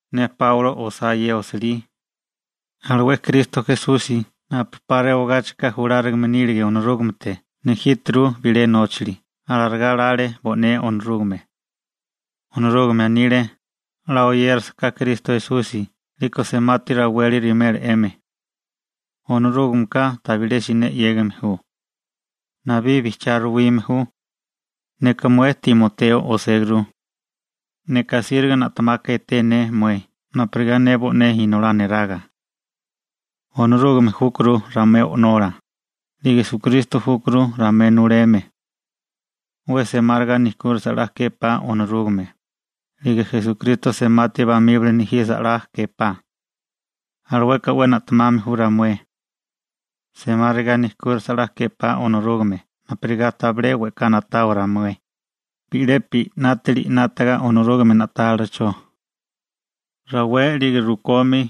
Ne Páulo osá ye osilí. Alué Kristo Esusi napu 'pa rewagáchika julárigame nílige Onorúgamete nejíturu bilé nóchali. Alarigá lale bo'né Onorúgame. Onorúgame anile: «'La oyérisiká Kristo Esusi 'liko semati raweli rewimela 'emi.» Onorúgameka tabilé siné 'yégame ju. Nabí bijchiá ruwime ju. Neka mué Timoteo oséguru. Neka asíriga na'temaka eteme ju mué napurigá ne bo'né inolá neraga. Onorúgame júkuru ramué O'nola, 'lige Esukristo júkuru ramué nuleme. 'We semáriga nejkúrasa 'la képá Onorúgame, 'lige Esukristo semati bamíbali nejisa 'la képá. Alueka 'we na'temame ju ramué. Semáriga nijkúrasa 'la képá Onorúgame napurigá tabilé we'ká na'tawa ramué, bi'lepi 'nátili 'nátaga Onorúgame na'tálilacho. Rawé 'lige rukomi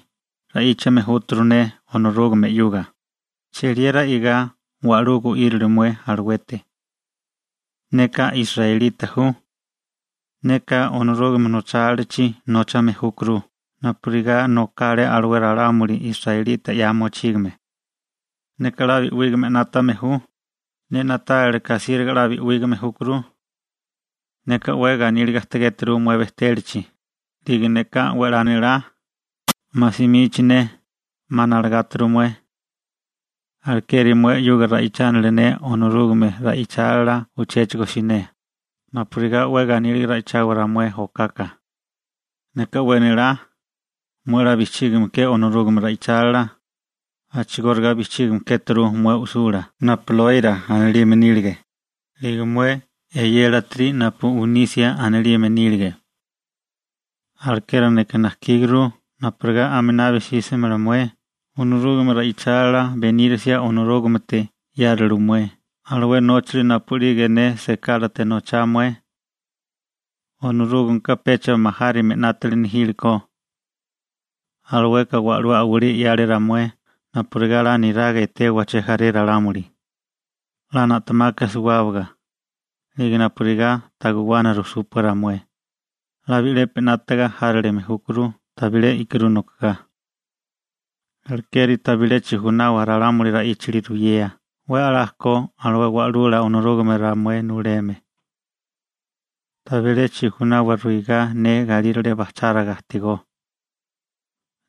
ra'íchame júturu ne Onorúgame 'yuga, cheliera i'gá wa'lú gu'írilio mué aluete. Neka israelita ju. Neka Onorúgame nochálilachi nóchame júkuru, napurigá nokale alué ralámuli israelita 'ya mochígame. Neka 'la bi'wígame 'nátame ju, ne na'tálilaká asíriga 'la bi'wígame júkuru. Neka 'we ganíliga ajtigéturu mué bejtélachi, 'lige neka 'we 'la nélá, 'ma simichi ne, 'ma nalagáturu mué. Alekeri mué 'yuga ra'ichánili ne Onorúgame ra'ichálila uchéchigo siné, napurigá 'we ganíliga ra'ichawa ramué okaka. Neka 'we nélá, mué 'la bijchígime ke Onorúgame ra'ichálila, a'chigóriga bijchígime kéturu mué u'sula napu Lóira anilime nílige, 'lige mué eyélatiri napu Unisia anilime nílige. Alekeri neka najkíguru napurigá aminabi sísimala mué Onorúgame ra'ichálila benírisia Onorúgamete 'yáliru mué alué nóchali napu'lige ne sekálate nochá mué. Onorúgameka pecha majárime 'nátili nejílekó. Alueka wa'lú a'walí 'yale ramué napurigá 'la niraga etewa chejaré ralámuli, 'la na'temaka suwábaga, 'lige napurigá ta guwana rujsúpua ramué, 'la bi'lepi 'nátaga járilime júkuru tabilé i'kirú nokogá. Alekeri tabilé chijunawa ralámuli ra'íchali ruyea 'we 'la ko alué wa'lula Onorúgame ramué nuleme. Tabilé chijunawa ruigá ne galírale bajcháriga ajtigó.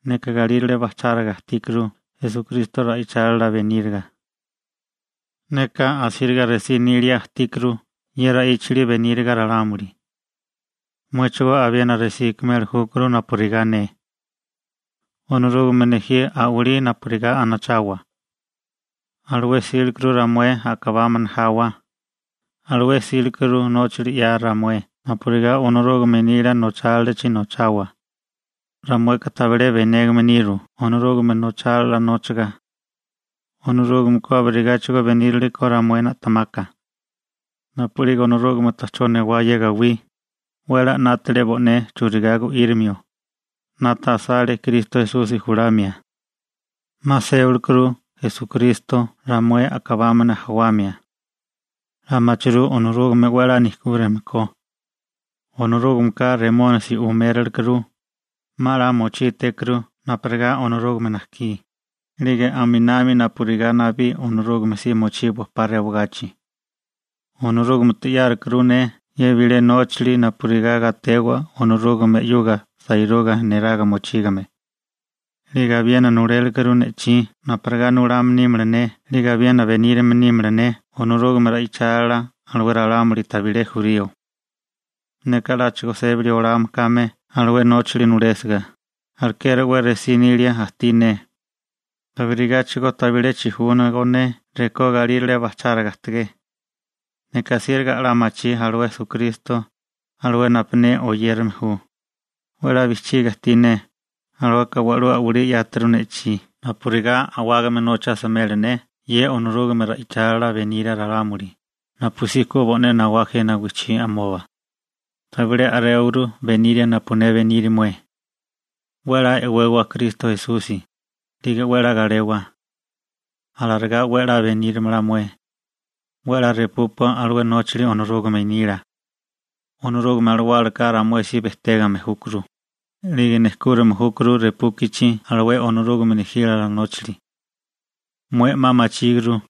Neka galírale bajcháriga ajtíkuru Esukristo ra'ichálila beníriga. Neka asíriga resí nilia ajtíkuru ye ra'íchali beníriga ralámuli. Muéchigo abiena resí ikimeli júkuru napurigá ne. Onorúgame nejí a'walí napurigá anachawa. Alué 'sílekuru ramué a'kabámana jawa, alué 'sílekuru nóchali 'ya ramué napurigá Onorúgame nila nochálilachi nochawa. Ramueka tabilé benégame niru Onorúgame nochálila nóchaga. Onorúgameka abirigáchigo benírile ko ramué na'temaka. Napu'lige Onorúgame ta'chó newá ye gawí, 'we 'la 'nátale bo'né churigá gu'írimio, 'nata asale Kristo Esusi julamia. 'Ma sébalekuru Esukristo ramué a'kabámana jawamia. 'La machirú Onorúgame 'we 'la nejkúrime ko. Onorúgameka Remónisi uméralekuru, 'ma 'la mochítékuru napurigá Onorúgame najkí, 'lige aminami napurigá nabí Onorúgame si mochiwa 'pa rewagachi. Onorúgamete 'yárukuru ne ye bilé nóchali napurigá gatewa Onorúgame 'yuga sairúgame neraga mochígame. 'Lige abiena nulélekuru ne'chí napurigá nulame nímala ne 'lige abiena benírame nímala ne Onorúgame ra'ichálila alué ralámuli tabilé jurío. Neka 'láchigo sébali olame kame alué nóchali nulésiga, alekeri 'we resí nilia ajtí ne. Abirigáchigo tabilé chijúnago ne rekó galírale bajcháriga ajtigé. Neka asíriga 'la machí alué Esukristo, alué napu ne oyérame ju. 'We 'la bijchiga ajtí ne, alueka wa'lú a'walí 'yáturu ne'chí napurigá a'wágame nocha asimela ne ye Onorúgame ra'ichálila beníria ralámuli, napusí ku bo'né nawá jena wijchimoba. Tabilé a'réwaguru beniria napu ne beniri mué. 'We 'la e'wewa Kristo Esusi, 'lige 'we 'la galewa. Alarigá 'we 'la benírimala mué. 'We 'la repúpua alué nóchali Onorúgame nila. Onorúgame Alawálaka ramué si bejtégame júkuru, 'lige nejkúrame júkuru repúkichi alué Onorúgame nejílala nóchali. Mué 'ma machíguru,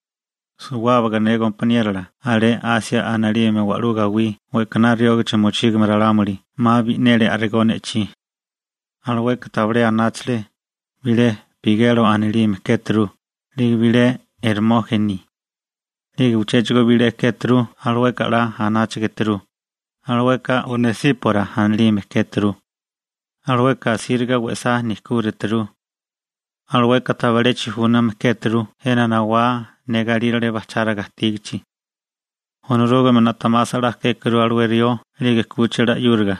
suwábaga ne gompaniérola alé Asia anilime wa'lú gawí we'kaná riógachi mochígame ralámuli 'ma bi'neli a'rigó ne'chí. Alueka tabilé anáchale, bilé Pigelo anilime kéturu, 'lige bilé Ermójeni. 'Lige uchéchigo bilé kéturu alueka 'la anáchigeturu, alueka Onesípora anilime kéturu. Alueka asíriga we'sá nejkúrituru. Alueka tabilé chijúname kéturu jena nawá ne galírale bajcháriga ajtígichi. Onorúgame na'temasa 'la kékuru alué rió 'lige 'kúchila 'yúriga.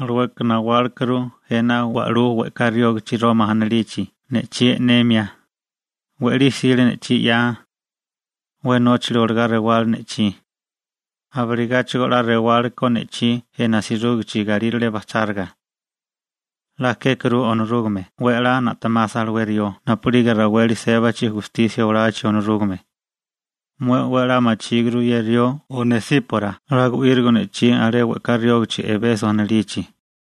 Alueka nawálekuru jena wa'lú we'ká riógichi Roma anilichi ne'chí e'nemia. We'lí 'sile ne'chí 'ya. 'We nóchali olagá rewá ne'chí. Abirigáchigo 'la rewale ko ne'chí jena asirúgichi galírale bajcháriga. 'La kékuru Onorúgame 'we 'la na'temasa alué rió napu'lige raweli sébachi gustisia olachi Onorúgame. Mué 'we 'la machíguru ye rió Onesípora 'la gu'írigo ne'chí alé we'ká riógichi Ebeso anilichi.